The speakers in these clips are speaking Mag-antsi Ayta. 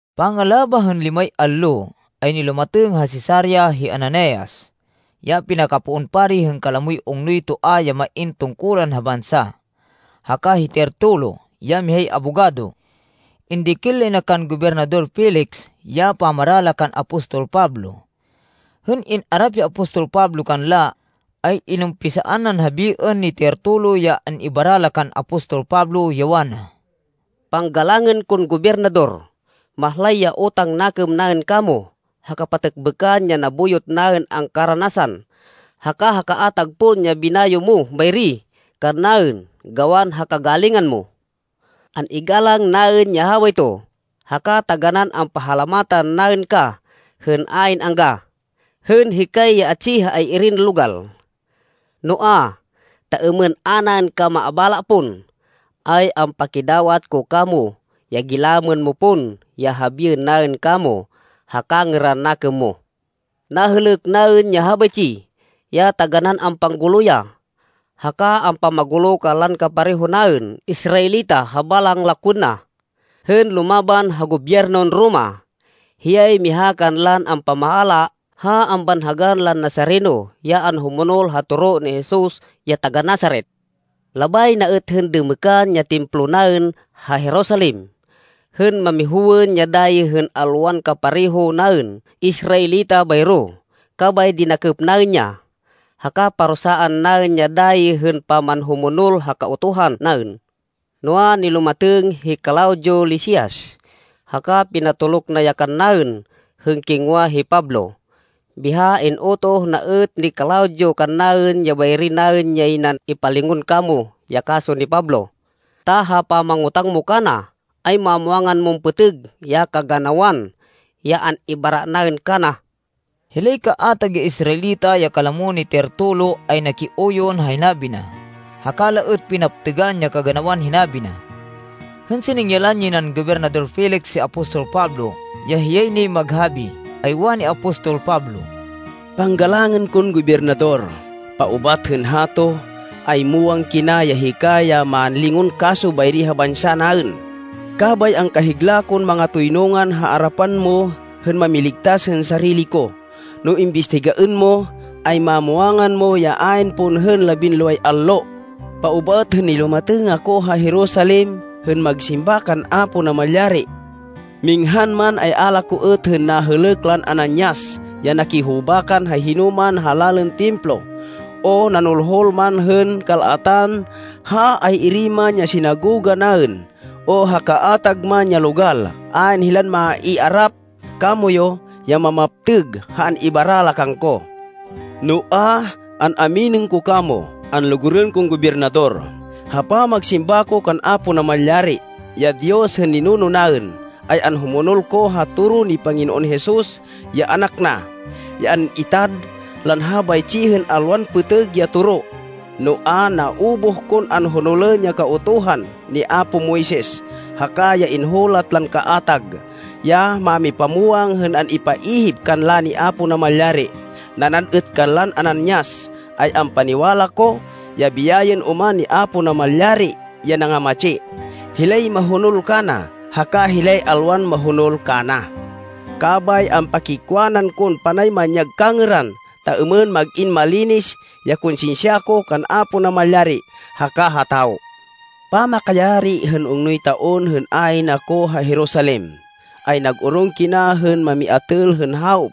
Pangalabah hên limay allo, ay nilumatêng ha Cesarea hi Ananias, ya pinakapoon pari hên kalamoy ungnoy toa ya main tungkulan ha bansa, haka hi Tertulo, ya mihay abogado. Indikil lay na kan Gobernador Felix ya pamara la kan apostol Pablo. Hên in-arap hi apostol Pablo kanla, ay inumpisaan nan habiên ni Tertulo ya an-ibara la kan apostol Pablo, ya wana, “Panggalangên kon Gobernador, mahlay ya utang nakêm naên kamo ha kapatêkbêkan ya nabuyot naên angkaranasan, haka ha kaatag pon ya binayo mo bayri kannaên gawan ha kagalingan mo. An-igalang naên ya habayto haka taganán ampahalamatan naên ka hên ayn angga, hên hikay ya atsi ha ay-irin logal. Noa, ta êmên a naên ka maabala pon, ay ampakidawat ko kamo ya gilamên mo pon ya habiên naên kamo ha kangêran nakêm mo. Nahêlêk naên ya habaytsi, ya taganán ampanggulo ya, haka ampamagulo kanlan kapareho naên Israelita ha balang lakwên na, hên lumaban ha gobyernon Roma. Hiyay miha kanlan ampamaala ha ambanhagan lan Nazareno, ya anhumonol ha toro ni Jesus ya taga-Nazaret. Labay na êt hên dêmêkan ya Templo naên ha Jerusalem, hên mamihowên ya dayi hên alwan kapareho naên Israelita bayro, kabay dinakêp naên ya. [Haka parusaan naên ya dayi hên pamanhumonol ha Kautuhan naên, noa, nilumatêng hi Claudio Lisias haka pinatoluk na ya kannaên hên kingwa hi Pablo. Biha in-utoh na êt ni Claudio kannaên ya bayri naên yay nan ipalingon kamo ya kaso ni Pablo,] ta ha pamangotang mo kana ay mamwangan mon pêtêg ya kaganawan ya an-ibara naên kana.” Hilay kaatag ya Israelita ya kalamo ni Tertulo ay nakiuyon ha hinabi na, haka la êt pinaptêgan ya kaganawan hinabi na. Hên siningyalan yay nan Gobernador Felix hi apostol Pablo ya hiyay nay maghabi, ay wani apostol Pablo, “Panggalangên kon Gobernador, paubat hên hato, ay muwang kina ya hika ya mánlingon kaso bayri ha bansa naên, kabay angkahigla kon mangatoynungan ha arapan mo hên mamiligtas hên sarili ko. No imbistigaên mo, ay mamwangan mo, ya ayn pon hên labinloway allo, paubat hên nilumatêng ako ha Jerusalem hên magsimba kan Apo Namalyari. Minghan man ay a la ko êt hên nahêlêk lan Ananias ya nakihubakan ha hinoman ha lalên Templo, o nanulhul man hên kal-atan ha ay-iri man ya sinagoga naên o ha kaatag man ya logal. Ayn hilan maiarap kamoyu ya mamaptêg ha an-ibara la kangko. Noa, an-aminên ko kamo, anlugurên kon Gobernador, ha pamagsimba ko kan Apo Namalyari, ya Diyos hên ninuno naên, ay anhumonol ko ha toro ni Panginoon Jesus ya anak na, ya an-itad lan habaytsi hên alwan pêtêg ya toro. Noa, naubuh kon anhonolên ya Kautuhan ni apo Moises, haka ya inhulat lan kaatag ya mámipamwang hên an-ipaihip kanla ni Apo Namalyari. Nanad êt kanlan Ananias, ay ampaniwala ko ya biyayên oman ni Apo Namalyari ya nangamatsi, hilay mahonol kana haka hilay alwan mahonol kana. Kabay ampakiwanan kon panay manyag kangêran, ta êmên mag-in malinis ya konsinsya ko kan Apo Namalyari haka ha tawo. “Pamakayari hên ungnoy taon hên ayn ako ha Jerusalem, ay nag-orong kina hên mamiatêl hên hawop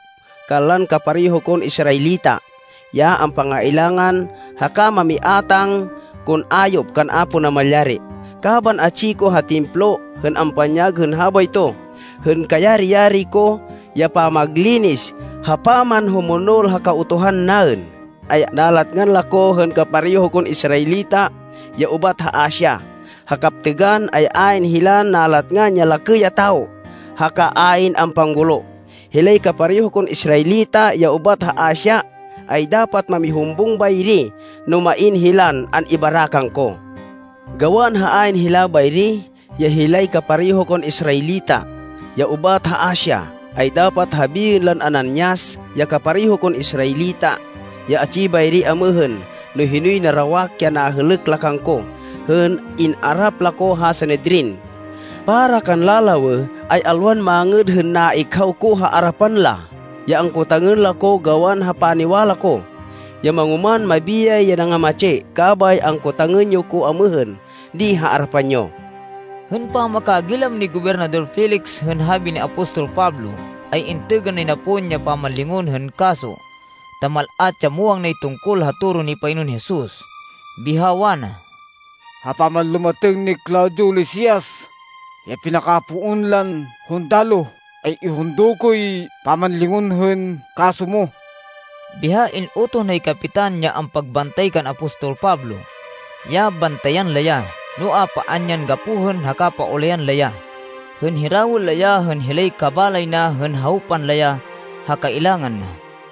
kanlan kapareho kon Israelita ya ampangailangan, haka mamiátang kon ayop kan Apo Namalyari. Kaban atsi ko ha Templo hên ampanyag hên habayto, hên kayari-yari ko ya pamaglinis ha pamanhumonol ha Kautuhan naên, ay nalatngan la ko hên kapareho kon Israelita ya ubat ha Asia. Ha kaptêgan, ay ayn hilan nalatngan ya lakê ya tawo haka ayn ampanggulo. Hilay kapareho kon Israelita ya ubat ha Asia, ay dapat mamihumbung bayri no main hilan an-ibara kangko. Gawan ha ayn hila bayri ya hilay kapareho kon Israelita ya ubat ha Asia, ay dapat habiên lan Ananias, ya kapareho kon Israelita ya atsi bayri amêhên no hinoy narawak ya nahêlêk la kangko hên in-arap la ko ha Sanedrin. Para kanla lawêh, ay alwan mangêd hên naikhaw ko ha arapan la, ya angkotangên la ko gawan ha paniwala ko, ya mangoman mabiyay ya nangamatsi. Kabay angkotangên yo ko amêhên di ha arapan yo.” Hên pamakagilam ni Gobernador Felix hên habi ni apostol Pablo, ay intêgên nay na pon ya pamanlingon hên kaso ta mal-at ya muwang nay tungkol ha toro ni Panginoon Jesus. Biha wana, “Ha pamanlumatêng ni Claudio Lisias, ya pinakapoon lan hundaloh ay ihundo koy pamanlingon hên kaso mo.” Biha in-utoh nay kapitan ya ampagbantay kan apostol Pablo, ya bantayan la ya, noa, paan yan gapohên haka paulayan la ya, hên hirawên la ya hên hilay kabalay na hên hawpan la ya ha kailangan na.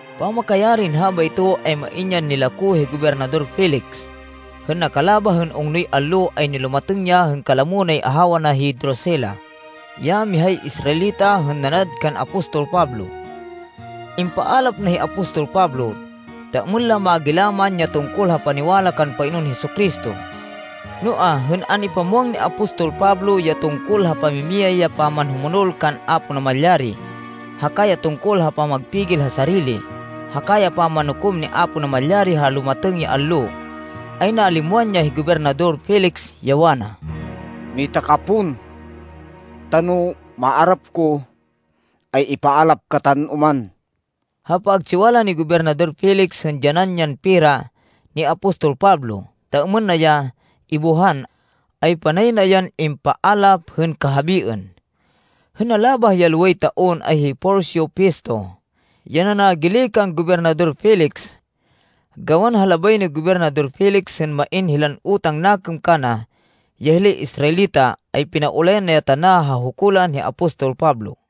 Pamakayarin habayto, ay main yan nilako hi Gobernador Felix. Hên nakalabah hên ungnoy allo, ay nilumatêng ya hên kalamo nay ahawa na hi Drusila, ya mihay Israelita hên nanad kan apostol Pablo. Impaalap na hi apostol Pablo, ta êmên la magilaman ya tungkol ha paniwala kan Panginoon Jesu-Cristo. Noa, hên an-ipamwang ni apostol Pablo ya tungkol ha pamimiyay ya pamanhumonol kan Apo Namalyari, haka ya tungkol ha pamagpigil ha sarili haka ya pamanukom ni Apo Namalyari ha lumatêng ya allo, ay nalimwan ya hi Gobernador Felix, ya wana, “Mita ka pon ta no maarap ko, ay ipaalap katan oman.” Ha pagtsiwala ni Gobernador Felix hên dyanan yan pera ni apostol Pablo, ta êmên na ya ibuhan, ay panay na yan impaalap hên kahabiên. Hên nalabah ya loway taon ay hi Porcio Festo ya nanagili kan Gobernador Felix. Gawan ha labay ni Gobernador Felix hên main hilan utang nakêm kana ya hilay Israelita, ay pinaulayan na ya tana ha hukulan hi apostol Pablo.